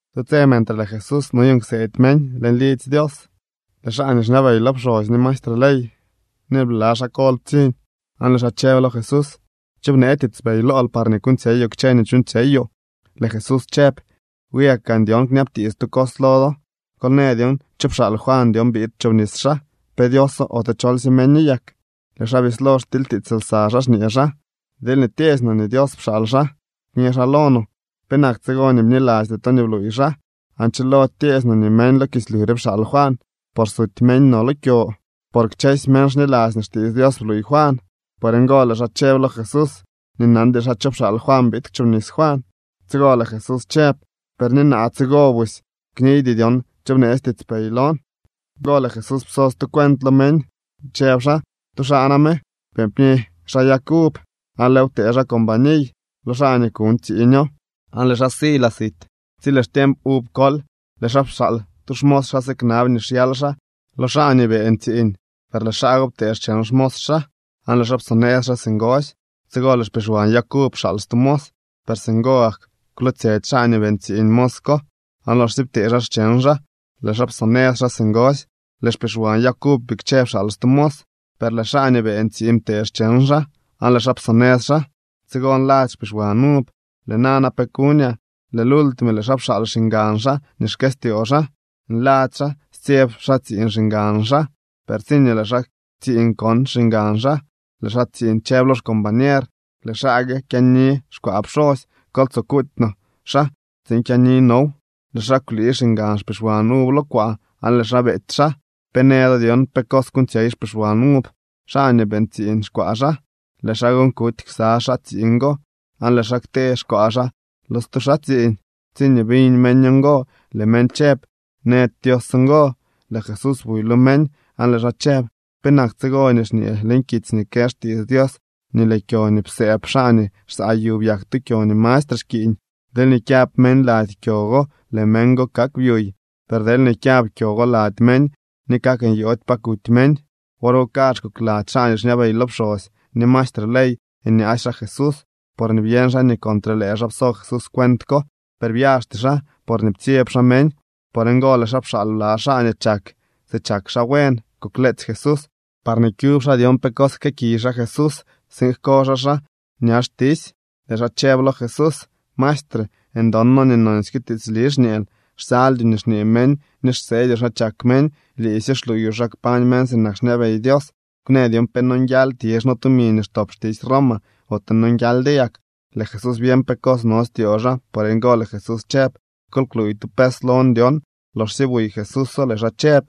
Tu tse mentre lëë Jesús noyuuñ kseedy meñ leñ lidzy Dios, lëë xaa nii xñabey lo pxosy ni maestre ley ni lëë bla xaa kol ptsiñ, aan lëë xaa chëb lo Jesús: —¿Cho bnee tiitspey lool par kuuñtsyeyoo kchë nii chuuñtsyeyoo? Lëë Jesús chëb: —Wi gak gaan dyon kñabtiits tu cos lo do. Kol në dyon: ¿cho pxaal Juan dyon biid kchoobnis xaa? ¿Pe Dioso, ote cholsye meño yak? Lëë xaa bislo xtilytiits lsa xaa, xñee xaa: —Deelñee tyeesy no nii Dios pxaal xaa, kñë xaa lo no: “¿Penak tsigo nii bnilasty to nii bluuy xaa?” Aan chilody tyeesy no nii meñ lo kislyu re pxaal Juan, por suty meñ no lo kyo. Por kchësy meñ xniladzy nii xtiits Dios bluuy Juan. Por ngo lëë xaa chëb lo Jesús nii nandy xaa cho pxaal Juan biid kchoobnis Juan. Tsigo lëë Jesús chëb: —Per ni naa tsigo busy kniydy dyon cho bneetsy tiitspey lon. Loxsye ngo lëë Jesús pso stu cuent lo meñ, chëb xaa: —Tu xaa name beeñ pni xaa yag uv, aan lëëw ptee xaa companiy lo xaa nii kuuñ tsiiñoo, aan lëë xaa si laa sit. Tsi lëë xtiemp uv kol, lëë xaa pxaal tu xmos xaa siknab nii xyal xaa lo xaa nii beeñ tsiiñ, per lëë xaa go ptee xcheñ xmos xaa, aan lëë xaa psonëz xaa singosy. Tsigo lëë xpixwan yag uv pxaal stu mos, per singo gak kwlootsyetsy xaa nii beeñ tsiiñ mos ko aan loxsye ptee xaa xcheñ xaa, lëë xaa psonëz xaa singosy. Lëë xpixwan yag uv bikche pxaal stu mos, per lëë xaa nii beeñ tsiiñ ptee xcheñ xaa, aan lëë xaa psonëz xaa. ’Tsigo nladzy xpixwan uv: “Lëë nana ¿pe kuñaa?” Lëë lultime, lëë xaa pxaal xiñgan xaa nii xkëstyoo xaa. Nladzy xaa stsyeb xaa tsiiñ xiñgan xaa. Per tsiñee lëë xaa tsiiñ kon xiñgan xaa, lëë xaa tsiiñ chëb lo xcombañer: “Lëë xaa gue kyaani xkwaa pxosy. Kol tsoo kuuty no xaa tsiin kyaani now.” Lëë xaa kwlii xiñgan xpixwan uv lo kwaa, aan lëë xaa beety xaa. ’¿Pe në do dyon pe cos kuuñtsyey xpixwan uv xaa nii beeñ tsiiñ xkwaa xaa? Lëë xaa gon kuty ksa xaa tsiiñ go, aan lëë xaa ktee xkwaa xaa lo stu xaa tsiiñ. Tsiñee biñ meñ ngo, lëë meñ chëb: —¡Nëdy Dios ngo! Lëë Jesús buy lo meñ aan lëë xaa chëb: —¿Penak tsigo nii xñee leñ kitsy nii kë xtiits Dios nii lëë kyo nii psëëb xaa nii xsaa yu byak tu kyo nii mastre xkiiñ? ’Deelñee kyab meñ lady kyo go, lëë meñ go kak byuy. Per deelñee kyab kyo go lady meñ, ni kak nyoody pa kuty meñ. Wor go kazh kokladzy xaa nii xñabey lo pxosy ni maestre ley nyaasy xaa Jesús, porñee byeñ xaa nii contre lëë xaa pso Jesús cuent ko. Per byaxty xaa, porñee ptsyeb xaa meñ. Por ngo lëë xaa pxaal bla xaa nii chak si chak xaa buen kukleetsy Jesús, parñee kyub xaa dyon pe cos jkëëkiy Jesús tsiin jko xaa xaa ña xtisy. Lëë xaa chëb lo Jesús: —Maestre, ndon noo nii nonsyke tiitsli xñeel. Xsaldyoo nii xñee meñ ni xseedyoo xa chak meñ. Liisy xluuyoo xa kpañ meñ sinak xñabey Dios. Kwnë dyon pe nonguial tizh no tumi nii xtop xtisy Roma, ote nonguialdyo yak. Lëë Jesús byeñ pe cos no styoo xaa, por ngo lëë Jesús chëb: —Kol kluuy tu pes lon dyon. Loxsye buy Jesúso, lëë xaa chëb: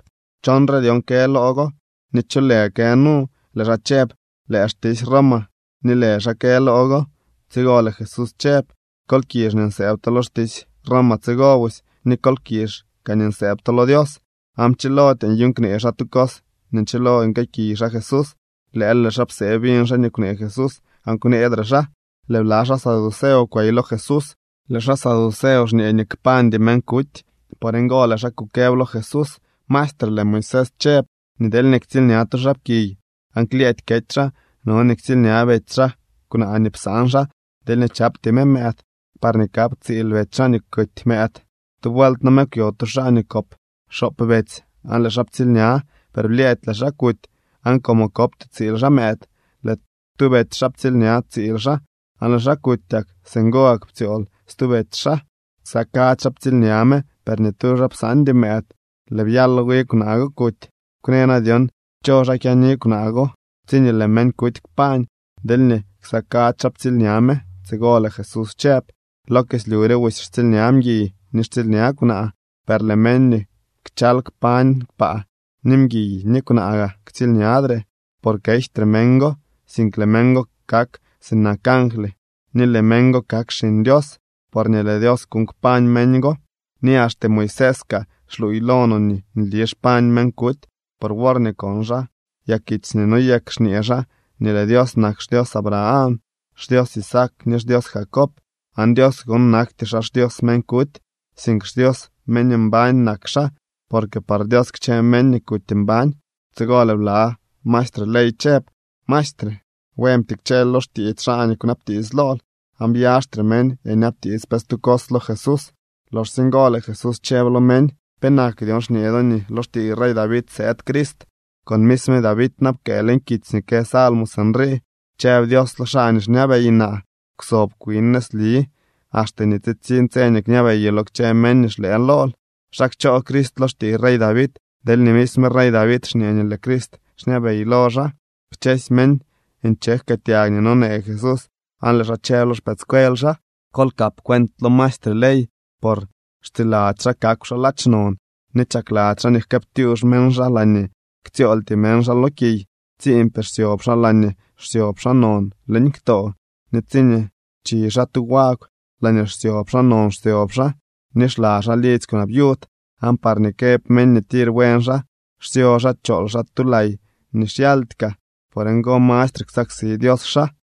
—¿Chonre dyon kë loo go, ni cho lë kë nu? Lëë xaa chëb: —Lëë xtisy Roma ni lë xaa kë loo go. Tsigo lëë Jesús chëb: —Kol kizh nii nsëëb to lo xtisy Roma tsigo busy, ni kol kizh kaa nii nsëëb to lo Dios. Aan pchilody nyuuñ knee xaa tu cos nii nchilo nguëëkiy xaa Jesús. Lëël lëë xaa psee biñ xaa nii kwnee Jesús, aan kwneedre xaa. Lëë bla xaa saduceo kwey lo Jesús. Lëë xaa saduceo xñee nii kpañdy meñ kuty, por ngo lëë xaa kukëb lo Jesús: —Maestre, lëë Moisés chëb nii deelñee ktsiilña tu xaapkiy aan klyëëdy kety xaa, no nii ktsiilña betsy xaa kwnaa nii psaan xaa deelñee chapty me mëëd, parñee kap tsiil betsy xaa nii kuty mëëd. Tu vuelt name kwyo tu xaa nii kop xoop betsy aan lëë xaa ptsiilña. Per blyëëdy lëë xaa kuty, aan como kopty tsiil xaa mëëd, lëë tu betsy xaa ptsiilña tsiil xaa aan lëë xaa kutyak. Singo gak ptsyool stu betsy xaa. Ksa kadzy xaa ptsiilña me, per ni tu xaa psaandy mëëd. Lëë byalo wi kwnaa go kuty. Kwnë na dyon cho xaa kyaani kwnaa go tsiñee lëë meñ kuty kpañ, deelñee ksa kadzy xaa ptsiilña me. Tsigo lëë Jesús chëb: —Lo kislyu re busy xtsiilña mguiy ni xtsiilña kwnaa, per lëë meñ nii kchal kpañ kpaa, ni mguiy ni kwnaa gaa ktsiilñadre. Por kejtre meñ go, sink lëë meñ go kak sinak angly ni lëë meñ go kak xiñ Dios porñee lëë Dios kuuñ kpañ meñ go. Ni axte Moisés kaa xluuy lo no nii nli xpañ meñ kuty por worñee kon xaa yakitsy nii noyek xñee xaa nii lëë Dios nak xDios Abraham, xDios Isaac ni xDios Jacob. Aan Dios gon nakty xaa xDios meñ kuty, sink xDios meñ mbañ nak xaa, porque par Dios kchë meñ nii kuty mbañ. Tsigo lëë bla maestre ley chëb: —Maestre, buen ptikcheel lo xtiits xaa nii kwnabtiits lool. Aan byaxtre meñ nyabtiits pe stu cos lo Jesús. Loxsye ngo lëë Jesús chëb lo meñ: —¿Penak dyon xñee do nii lo xtiiy rey David sëëd Crist?, con misme David na pkëë leñ kitsy nii kë salmos sinrii: Chëb Dios lo xaa nii xñabey naa: “Kwsob kwin nëzli, axte nii tsitsiñ tse nii kñabeyoo lo kchë meñ nii xlëë lool.” ¿Xa kchoo Crist lo xtiiy rey David, deelñee misme rey David xñee nii lëë Crist xñabey lo xaa? Kchësy meñ nche jkëëtyag nii nonee Jesús aan lëë xaa chëb lo xpëëdscuel xaa: —Kol kap cuent lo maestre ley, por xtsiladzy xaa kakw xaa ladx non, ni chakladzy xaa nii jkëëptyux meñ xaa laañee ktsyooltyee meñ xaa lo kiy. Tsiimpee xsyob xaa laañee xsyob xaa non leñ ktoo, ni tsiñee chi xaa tu wagw, laañee xsyob xaa non xsyob xaa. Ni xla xaa lidzy kwnaa viud, aan parñee këb meñ nii tir buen xaa, xsyo xaa chool xaa tu lay nii xyaldy kaa. Por ngo mastre ksaksi Dios xaa.